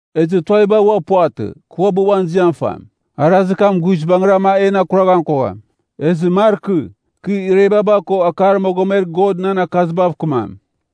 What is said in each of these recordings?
Ezɨ tuaviba ua puvatɨ. Kɨ uabɨ uan ziam fam. Arazir kam guizbangrama en akuraghan kogham. Ezɨ markɨ, kɨ irebaba ko akar mogomer God nan akazibav kɨmam.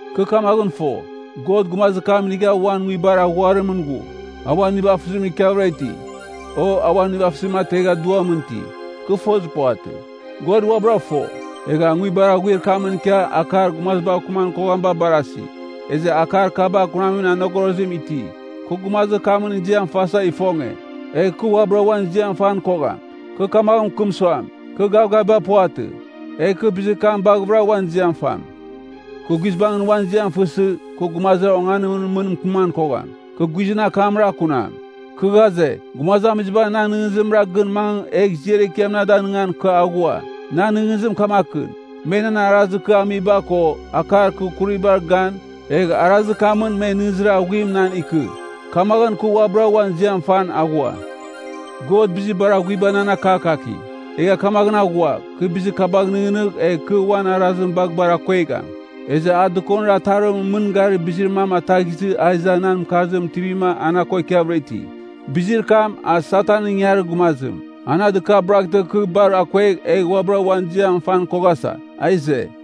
Kɨ kamaghɨn fo, God gumazir kam inigha uan Nguibar Aghuarimɨn ghu. (A uan nivafɨzim ikiavɨra iti, o uan nivafɨzim ategha duamɨn iti, kɨ fozir puvatɨ, God uabɨra fo.) Egha a Nguibar Aghuarir kamɨn ikia akar gumazibav kɨman koghamiba barasi, ezɨ akar kaba akunamin anogorozim iti. Kɨ gumazir kamɨn ziam fasa ifonge, egh kɨ uabɨra uan ziam fan kogham. Kɨ kamaghɨn mɨkɨm suam, kɨ gavgaviba puvatɨ, egh kɨ bizir kam baghɨvɨrama uan ziam fam. Kɨ guizbangɨn uan ziam fɨsɨ, kɨ gumazir onganimɨn mɨn mɨkɨman kogham. Kɨ guizɨn akamra akunam. Kɨ ghaze, gumazamiziba nan nɨghnɨzimra gɨn mangɨ egh ziar ekiam na danɨngan, kɨ aghua. Nan nɨghnɨzim kamakɨn: Me nan arazir kɨ amiba, ko akar kɨ kuribara gan, egh arazir kamɨn me nɨghnɨzir aghuim nan ikɨ. Kamaghɨn, kɨ uabɨra uan ziam fan aghua. God bizir bar aghuiba nan akakaki, egha kamaghɨn aghua, kɨ bizir kabagh nɨghnɨgh egh kɨ uan arazim bagh bar akuegham. Ezɨ a dɨkonir atarimɨn mɨn garir bizir mam ataghizɨ a iza nan mɨkarzim mɨtiva na ko ikiavɨra iti. Bizir kam, a Satanɨn ingangarir gumazim, a na dɨkabɨraghtɨ kɨ bar akuegh egh uabɨra uan ziam fan koghasa, a ize.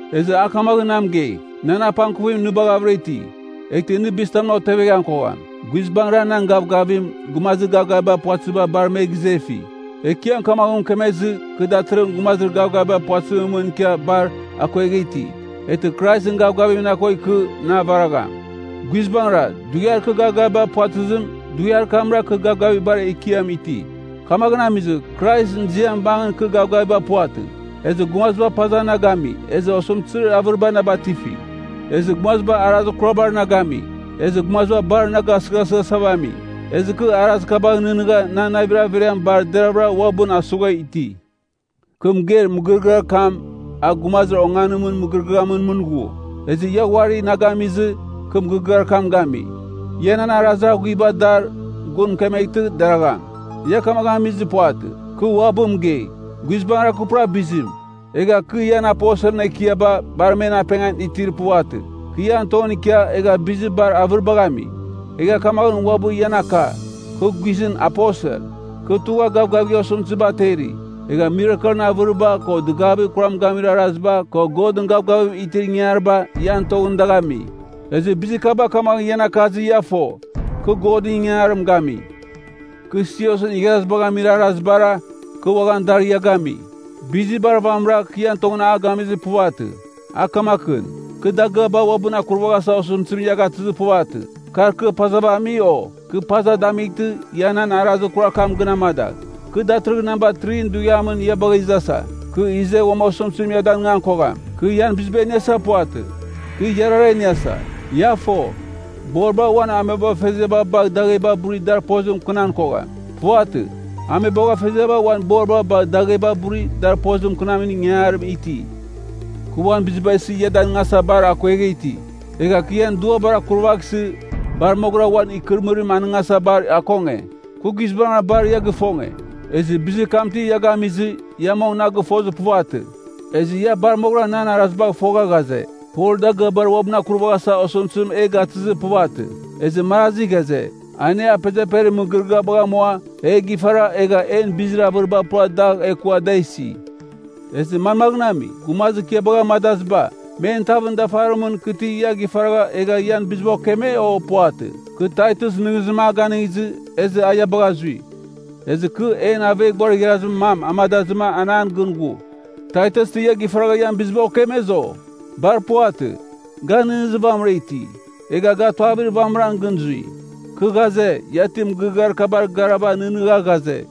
Ezɨ a kamaghɨn na mɨgei, “Nan apangkuvim nɨ baghavɨra iti, eghtɨ nɨ bizitam oteveghan kogham. Guizbangɨra, nan gavgavim, gumazir gavgaviba puvatɨziba, bar me gizefi.” Ekiam kamaghɨn mɨkemezɨ, kɨ datɨrɨghɨn gumazir gavgaviba puvatɨzimɨn mɨn ikia bar akuegha iti, eghtɨ Kraisɨn gavgavim na ko ikɨ na avaragham. Guizbangɨra, dughiar kɨ gavgaviba puvatɨzim, dughiar kamra kɨ gavgavir bar ekiam iti. Kamaghɨn amizɨ, Kraisɨn ziam bangɨn kɨ gavgaviba puvatɨ, ezɨ gumaziba pazavɨra na gami, ezɨ osɨmtɨzir avɨriba na batifi, ezɨ gumaziba arazir kurabar na gami, ezɨ gumaziba bar na gasɨghasɨghasava ami. Ezɨ kɨ arazir kabagh nɨghnɨgha nan navir averiam bar deravɨra uabɨn asugha iti. Kɨ mɨgeir mɨgɨrɨgɨar kam, a gumazir onganimɨn mɨgɨrɨgɨamɨn mɨn ghu. Ezɨ ia uari na gamizɨ, kɨ mɨgɨrɨgɨar kam gami. Ia nan arazir aghuiba dar, gun mɨkemeghtɨ, deragham. Ia kamaghɨn amizir puvatɨ, kɨ uabɨ mɨgei. Guizbangɨra kɨ pura bizim, egha kɨ ian “Aposelɨn Ekiaba” bar men apengan itir puvatɨ. Kɨ ian tongɨn ikia egha bizir bar avɨribagh ami, egha kamaghɨn uabɨ ian aka, kɨ guizɨn Aposel. Kɨ tugha gavgavigha osɨmtɨziba ateri, egha mirakelɨn avɨriba, ko dɨgavir kuram gamir araziba, ko Godɨn gavgavim itir ingangariba, ian tongɨn dagh ami. Ezɨ bizir kaba kamaghɨn nan ian akazɨ ia fo, kɨ Godɨn ingangarim gami. Kɨ siosɨn igharazibagh amir arazibara, kɨ uaghan dar ia gami. Bizir bar vamɨra, kɨ ian tongɨn a gamizir puvatɨ, a kamakɨn: Kɨ dagɨabar uabɨn akurvaghasa osɨmtɨzim ia gatɨzir puvatɨ. Kar kɨ pazava ami, o? Kɨ paza damightɨ, ia nan arazir kurar kam gɨn amadagh. Kɨ datɨrɨghɨn namba 3ɨn dughiamɨn ia bagh izasa. Kɨ izegh uam osɨmtɨzim ia danɨngan kogham. Kɨ ian biziba iniasa puvatɨ, kɨ iarara iniasa. Ia fo, boriba uan ameboghfeziaba bagh dagheba buri dar pozim mɨkɨnan kogham. Puvatɨ. Ameboghfeziaba uan boriba bagh dagheba buriva dar pozim mɨkɨnamin ingangarim iti. Kɨ uan biziba isɨ ia danɨngasa bar akuegha iti. Egha kɨ ian duabar akurvaghsɨ, bar moghɨra uan ikɨrɨmɨrim anɨngasa bar akonge. Kɨ guizbangɨra bar ia gifonge, ezɨ bizir kam ti ia gamizɨ, ia mong na gifongezir puvatɨ. Ezɨ ia bar moghɨra nan arazibagh fogha ghaze, “Pol dagɨabar uabɨn akurvaghasa osɨmtɨzim e gatɨzir puvatɨ.” Ezɨ marazi ghaze, “An e apezeperir mɨgɨrɨgɨabagh amua, e gifara egha en bizir avɨriba pura dagh ekua da isi.” Ezɨ manmaghɨn ami? Gumazir kɨ ia bagh amadaziba, men tavɨn dafarimɨn, kɨ ti ia gifaragha egha ian biziba okeme, o? Puvatɨ. Kɨ Taitus nɨghnɨzim a ganɨngizɨ, ezɨ a ia bagha zui. Ezɨ kɨ en aveghbuar igharazir mam amadazɨma an an gɨn ghu. Taitus ti ia gifaragha ian biziba okeme, o? Bar puvatɨ. Ga nɨghnɨzir vamɨra iti. Egha ga tuavir vamɨran gɨn zui. Kɨ ghaze, ia ti mɨgɨrɨgɨar kabar garava nɨghnɨgha ghaze,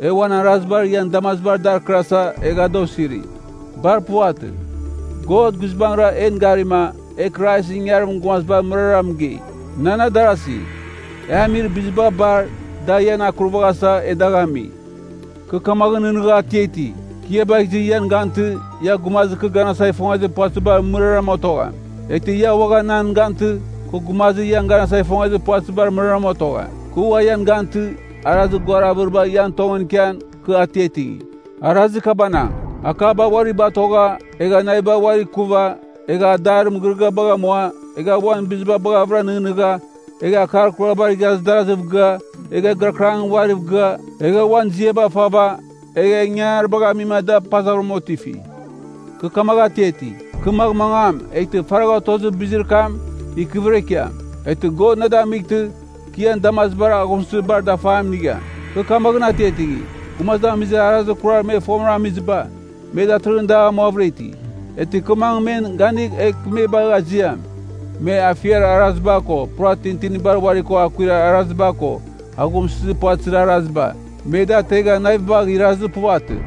e uan arazibar ian damazibar dar kɨrasa, egha da osiri. Bar puvatɨ. God guizbangɨra en garima, e Kraisɨn ingangarir gumazibar mɨrara mɨgei. Nan adarasi, e amir biziba bar, da ian akurvaghasa, e dagh ami. Kɨ kamaghɨn nɨghnɨgha atiati, kɨ ia bagh izɨ ian gantɨ, ia gumazir kɨ ganasa ifongezir puvatɨzibar mɨraram otogham. Eghtɨ ia uaghan nan gantɨ, kɨ gumazir ia ganasa ifongezir puvatɨzimɨn mɨraram otogham. Kɨ ua ian gantɨ, arazir guar avɨrir kaba ian tongɨn ikian, kɨ atiatingi. Arazir kabanang, akaba uari batogha, egha naviba uarir ikuva, egha adarir mɨgɨrɨgɨabagh amua, egha uan biziba baghavɨra nɨghnɨgha, egha akar kurabar igharaz daraziv gɨa, egha gɨrakɨrangɨn uariv gɨa, egha uan ziaba fava, egha ingangaribagh amima da pazavɨram otifi. Kɨ kamaghɨn atiati, kɨ magh mangam, eghtɨ faragha otozir bizir kam, ikɨvɨra ikiam. Eghtɨ God na damightɨ, kɨ ian damazibar aghumsɨzir bar dafam inigham. Kɨ kamaghɨn atiatingi, gumazamizir arazir kurar me fomɨra amiziba, me datɨrɨghɨn dagh amuavɨra iti, eghtɨ kɨ mangɨ men ganigh ua me bagh aziam. Me afiar araziba ko, pura tintinibar uari ko akuir araziba ko, aghumsɨzir puvatɨzir araziba, me da tegha navibagh irazir puvatɨ.